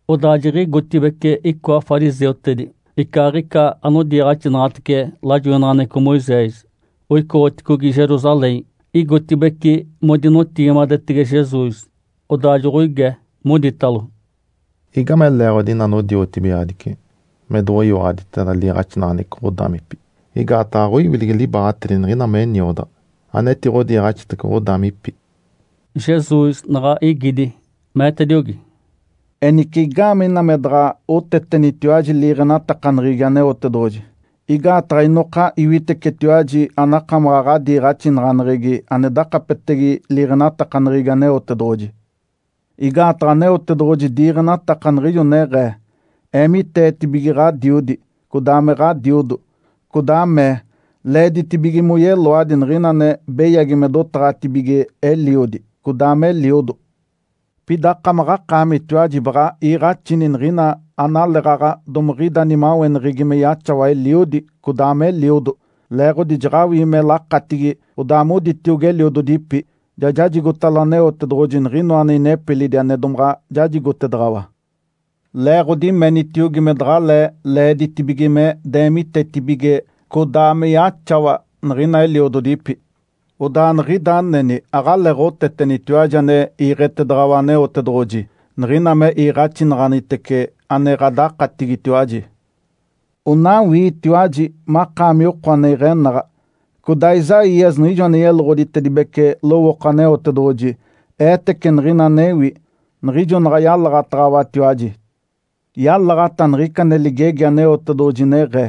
Odaa jiɡ̶igotibeci icoa fariseutedi icaaɡ̶ica anodiiɡ̶axinaɡ̶atece lajoinaɡ̶aneɡ̶eco Moisés, oicoɡ̶oticogi Jerusalém. Igotibeci modinotigimadetege Jesus, odaa joɡ̶oige, moditalo, “Igame leeɡ̶odi ina anodiotibigaɡ̶adici me doɡ̶oyiwaɡ̶aditeda liiɡ̶axinaɡ̶aneɡ̶eco ɡ̶odaamipi? Igaataɡ̶a aɡ̶oiwilegi libaaɡ̶atedi niɡ̶ina me niodaɡ̶a, anetiɡ̶odiiɡ̶axitece ɡ̶odaamipi.” Jesus naɡ̶a igidi meetediogi, “Enice, igaamee ina me daɡ̶aɡ̶a otetenitatiwaji liiɡ̶enatakaneɡ̶egi Aneotedoɡ̶oji? Igaataɡ̶a inoka iwitecetiwaji anakamaɡ̶a ɡ̶adiiɡ̶axinaɡ̶aneɡ̶egi ane dakapetege liiɡ̶enatakaneɡ̶egi Aneotedoɡ̶oji. Igaataɡ̶a Aneotedoɡ̶oji diiɡ̶enataka, niɡ̶ijo neɡ̶ee, ‘Eemiteetibige ɡ̶adiodi, codaa me ɡ̶adiodo.’ codaa mee, ‘Leeditibige moyeloadi niɡ̶ina ane beyagi me dotaɡ̶atibige eliodi, codaa me eliodo.’ Pida akamaɡ̶akaamitiwaji baɡ̶a iiɡ̶axini niɡ̶ina analeeɡ̶aɡ̶a domiɡ̶ida nimaweneɡ̶egi me yaxawa eliodi codaa me eliodo, leeɡ̶odi jaɡ̶awii me lakatigi, odaa moditiogi eliododipi, ‘Ja jajigotalo Aneotedoɡ̶oji niɡ̶ina ane inepilidi ane domaɡ̶a jajigotedaɡ̶awa’, Leeɡ̶odi menitiogi me daɡ̶alee leeditibige me deemitetibige codaa me yaxawa niɡ̶ina eliododipi. Odaa niɡ̶ida aneni aɡ̶aleeɡ̶otetenitiwaji ane iiɡ̶etedaɡ̶awa Aneotedoɡ̶oji, niɡ̶ina me iiɡ̶axinaɡ̶anitece ane ɡ̶adakatigitiwaji. Onawiitiwaji makaami oko ane iɡ̶enaɡ̶a. Codaa Isaías niɡ̶ijo ane yeloɡ̶oditedibece lowooko Aneotedoɡ̶oji eetece niɡ̶ina anewi, niɡ̶ijo naɡ̶a yalaɡ̶ataɡ̶awatiwaji. Yalaɡ̶ata niɡ̶ica ane ligegi Aneotedoɡ̶oji, neɡ̶ee,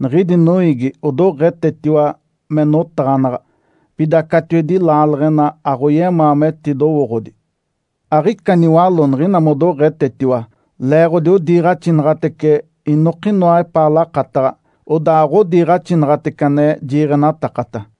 ‘Niɡ̶idi noiigi odoɡ̶etetiwa me notaɡ̶anaɡ̶a. Pida catiwedi laaleɡ̶ena aɡ̶oyemaa metidowooɡ̶odi. Aɡ̶ica niwaló niɡ̶ina modoɡ̶etetiwa, leeɡ̶odi odiiɡ̶axinaɡ̶atece inokinoa epaa lakataɡ̶a, odaa aɡ̶odiiɡ̶axinaɡ̶atece ane jiiɡ̶enatakata.’”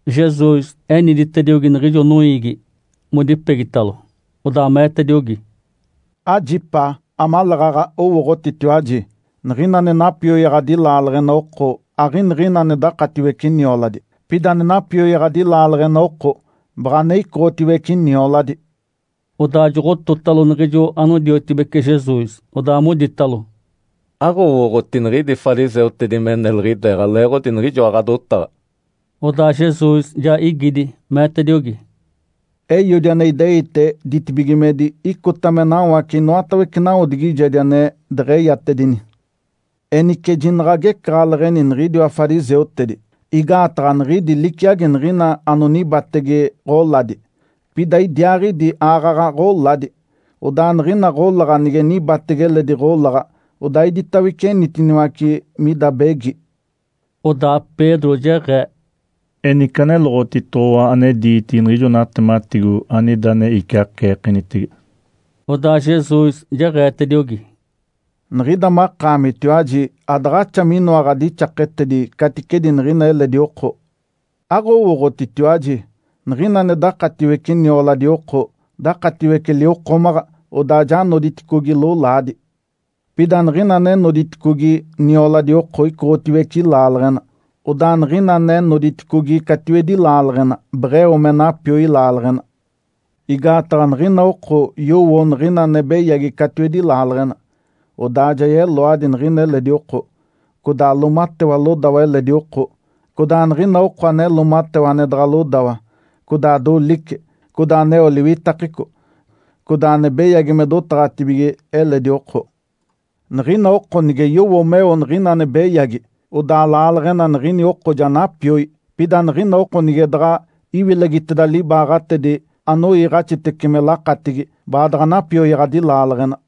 Jesus eniditediogi niɡ̶ijo noiigi modipegitalo, odaa meetediogi, “Ajipaa amaleeɡ̶aɡ̶a mowooɡ̶otitiwaji! Niɡ̶ina ane napioyaɡ̶adi laaleɡ̶ena oko aɡ̶iniɡ̶ina ane dakatiwece nioladi. Pida ane napioyaɡ̶adi laaleɡ̶ena oko baɡ̶a ane icoɡ̶otiwece nioladi.” Odaa joɡ̶ototalo niɡ̶ijo anodiotibece Jesus, odaa moditalo, “Aɡ̶owooɡ̶oti niɡ̶idi fariseutedi me neliɡ̶ideeɡ̶a leeɡ̶odi niɡ̶ijoa ɡ̶adotaɡ̶a?” Odaa Jesus ja igidi, meetediogi, “Eiodi ane ideite ditibigimedi icota me nawace inoatawece nawodigijedi ane deɡ̶eyatedini. Enice jinaɡ̶a agecaɡ̶aleɡ̶eni niɡ̶idiwa fariseutedi! Igaataɡ̶a niɡ̶idi liciagi niɡ̶ina anonibatege ɡ̶oladi, pida idiaaɡ̶idi aaɡ̶aɡ̶a ɡ̶oladi. Odaa niɡ̶ina ɡ̶olaɡ̶a nige nibatege eledi ɡ̶olaɡ̶a, odaa iditawece enitiniwace mida begi.” Odaa Pedro jeɡ̶ee, “Enice, aneloɡ̶otitoɡ̶owa ane diitigi niɡ̶ijo natematigo anida ane iciaceekenitege.” Odaa Jesus jeɡ̶eetediogi, “Niɡ̶ida makaamitiwaji adaɡ̶axa minoa ɡ̶adixaketedi caticedi niɡ̶ina eledi oko! Aɡ̶owooɡ̶otitiwaji? Niɡ̶ina ane dakatiwece nioladi oko, dakatiwece liwokomaɡ̶a, odaa ja noditicogi lolaadi. Pida niɡ̶ina ane noditicogi nioladi oko icoɡ̶otiwece laaleɡ̶ena. Odaa niɡ̶ina ane noditicogi catiwedi laaleɡ̶ena beɡ̶eo me napioi laaleɡ̶ena. Igaataɡ̶a niɡ̶ina oko yowo niɡ̶ina ane beyagi catiwedi laaleɡ̶ena, odaa ja yeloadi niɡ̶ina eledi oko, codaa loomatewa lodawa eledi oko, codaa niɡ̶ina oko ane loomatewa ane daɡ̶a lodawa, codaa dolice, codaa aneo liwitakeco, codaa ane beyagi me dotaɡ̶atibige eledi oko. Niɡ̶ina oko nige yowo meo niɡ̶ina ane beyagi, odaa laaleɡ̶ena niɡ̶ini oko ja napioi. Pida niɡ̶ina oko nige daɡ̶a iwilegiteda libaaɡ̶atedi anoiiɡ̶axitece me lakatigi, baadaɡ̶a napioyaɡ̶adi laaleɡ̶ena.”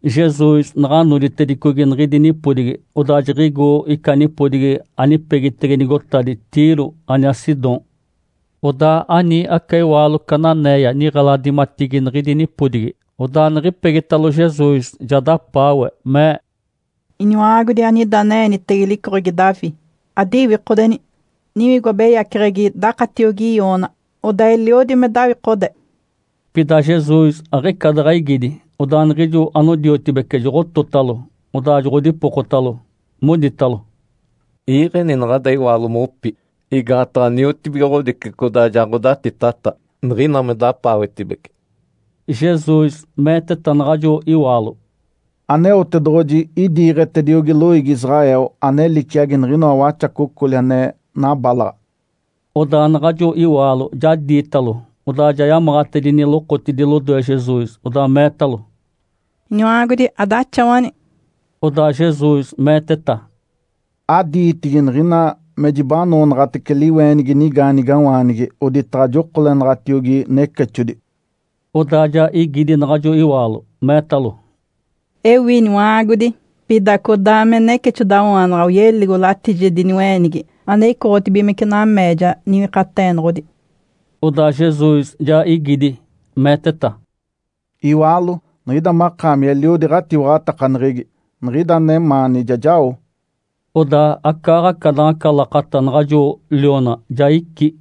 Jesus naɡ̶a noditedicogi niɡ̶idi nipodigi, odaa jiɡ̶igo ica nipodigi anipegitege nigotadi Tiro aniaa Sidom. Odaa ani aca iwaalo cananéia niɡ̶eladimatigi niɡ̶idi nipodigi. Odaa niɡ̶ipegitalo Jesus, ja dapaawe, mee, “Iniwa-aagodi, anida ane-eenitege licoɡ̶egi Davi, adiwikodeni! Niwigo abeyaceɡ̶egi dakatiogi i-oona, odaa eliodi me dawikode.” Pida Jesus aɡ̶ica daɡ̶a igidi. Odaa niɡ̶ijo anodiotibece joɡ̶ototalo, odaa joɡ̶odipokotalo, moditalo, “Iiɡ̶eni naɡ̶ada iwaalo mopi, igaataɡ̶a niotibigoɡ̶odici codaa ja ɡ̶odatitata niɡ̶ina me dapaawetibece.” Jesus meeteta naɡ̶ajo iwaalo, “Aneotedoɡ̶oji idiiɡ̶etediogi loiigi Israel ane liciagi niɡ̶inoa waxacocoli ane nabalaɡ̶a.” Odaa naɡ̶ajo iwaalo ja diitalo, odaa ja yamaɡ̶atedini lokotidi lodoe Jesus, odaa meetalo, “Iniwa-aagodi, adaxawani!” Odaa Jesus meeteta, “Adiitigi niɡ̶ina me jibanoonaɡ̶atece liweenigi nigaanigawaanigi, oditaɡ̶a jokolenaɡ̶atiogi necexodi.” Odaa ja igidi naɡ̶ajo iwaalo, meetalo, “Ewi, Iniwa-aagodi! Pida codaa me necexodawaanaɡ̶a oyeligo latijedi niwe-eenigi ane icoɡ̶otibigimece nameeja niwikateenoɡ̶odi.” Odaa Jesus ja igidi, meeteta, “Iwaalo, niɡ̶ida makaami eliodi ɡ̶atiwaɡ̶atakaneɡ̶egi. Niɡ̶ida anemaani ja jao.” Odaa acaaɡ̶aca naɡ̶aca lakata naɡ̶ajo liona ja icí.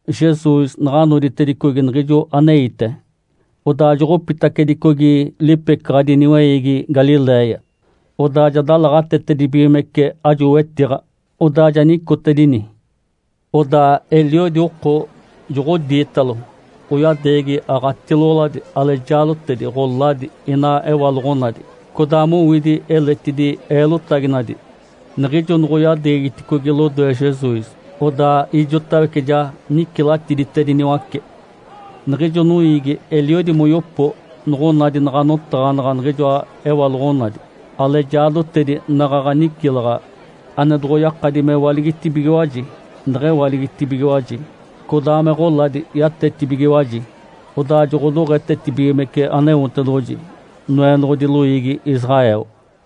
Jesus naɡ̶a noditedicogi niɡ̶ijo aneite, odaa joɡ̶opitacedicogi lipecaɡ̶adi niweiigi Galiléia. Odaa ja dalaɡ̶atetedibigimece ajo wetiɡ̶a, odaa ja nicotedini. Odaa eliodi oko joɡ̶odiitalo, oyadeegi aɡ̶atiloɡ̶oladi, alejaadotedi, ɡ̶oladi, ina ewaloɡ̶onadi, codaa mowidi eletidi eelotaginadi. Niɡ̶ijo noɡ̶oyadeegiticogi lodoe Jesus, odaa ijotawece ja nicilatiditediniwace. Niɡ̶ijo noiigi eliodi moyopo noɡ̶onadi naɡ̶a notaɡ̶anaɡ̶a niɡ̶ijoa ewaloɡ̶onadi, alejaadotedi naɡ̶aɡ̶a nicilaɡ̶a, ane doɡ̶oyakadi mewaligitibigiwaji neɡ̶ewaligitibigiwaji, codaa me ɡ̶oladi yatetibigiwaji. Odaa joɡ̶odoɡ̶etetibigimece Aneotedoɡ̶oji, Noenoɡ̶odi loiigi Israel.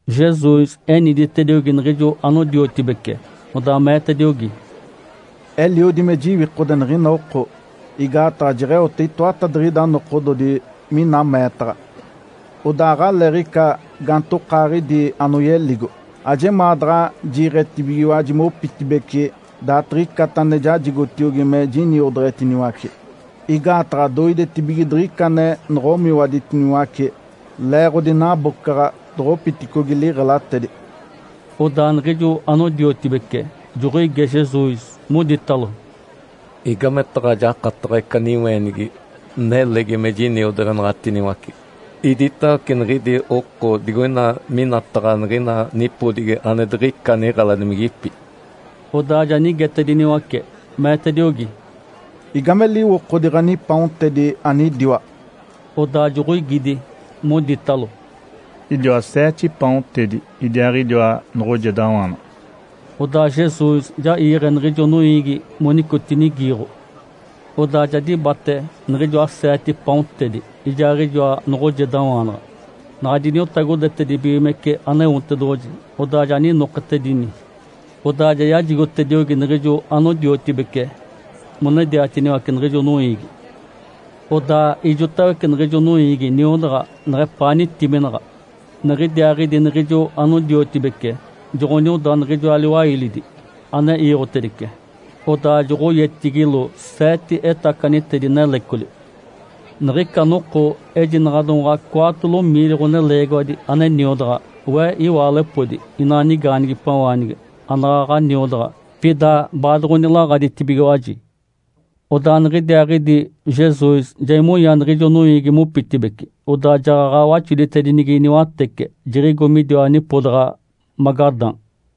Jesus eniditediogi niɡ̶ijo anodiotibece, odaa meetediogi, “Eliodi me jiwikode niɡ̶ina oko, igaataɡ̶a jeɡ̶eote itoatadiɡ̶ida nokododi mina meetaɡ̶a, odaa aɡ̶aleeɡ̶ica gaantokaaɡ̶idi anoyeligo. Ajemaa daɡ̶a jiiɡ̶etibigiwaji mopitibeci daaditiɡ̶icata ane jajigotiogi me jiniodeɡ̶etiniwace, igaataɡ̶a doidetibige diɡ̶ica ane noɡ̶omiwaditiniwace leeɡ̶odi nabocaɡ̶a doɡ̶opiticogi liɡ̶elatedi.” Odaa niɡ̶ijo anodiotibece joɡ̶oige Jesus, moditalo, “Igametaɡ̶a jakataɡ̶a ica niweenigi nelegi me jiniodeɡ̶enaɡ̶atiniwace iditawece niɡ̶idi oko digoina minataɡ̶a niɡ̶ina nipodigi ane diɡ̶ica niɡ̶eladimigipi?” Odaa ja nigetediniwace, meetediogi, “Igame liwokodi ɡ̶anipaontedi anidiwa?” Odaa joɡ̶oigidi, moditalo, “Idiwa seete paontedi idiaaɡ̶idiwa noɡ̶ojedawaanaɡ̶a.” Odaa Jesus ja iiɡ̶e niɡ̶ijo noiigi monicotinigiiɡ̶o. Odaa ja dibate niɡ̶ijoa seete paontedi ijaaɡ̶ijoa noɡ̶ojedawaanaɡ̶a, naɡ̶a diniotagodetedibigimece Aneotedoɡ̶oji, odaa ja ninoketedini, odaa ja yajigotediogi niɡ̶ijo anodiotibece monediatiniwace niɡ̶ijo noiigi. Odaa ijotawece niɡ̶ijo noiigi niodaɡ̶a, neɡ̶epaa nitiminaɡ̶a. Niɡ̶idiaaɡ̶idi niɡ̶ijo anodiotibece joɡ̶onioda niɡ̶ijoa liwailidi ane iiɡ̶otedice, odaa joɡ̶oyetigilo seete etacanitedi nelecoli. Niɡ̶ica noko ejinaɡ̶a domaɡ̶a cwaatolo miili ɡ̶oneleegiwadi ane niodaɡ̶a, we iwaalepodi, inaa nigaanigipawaanigi anaɡ̶aɡ̶a niodaɡ̶a, pida baadoɡ̶onilaaɡ̶aditibigiwaji. Odaa niɡ̶idiaaɡ̶idi Jesus ja imonya niɡ̶ijo noiigi mopitibeci, odaa jaɡ̶aɡ̶a waxoditedinigi niwatece, jiɡ̶igo midiwa nipodaɡ̶a Magadã.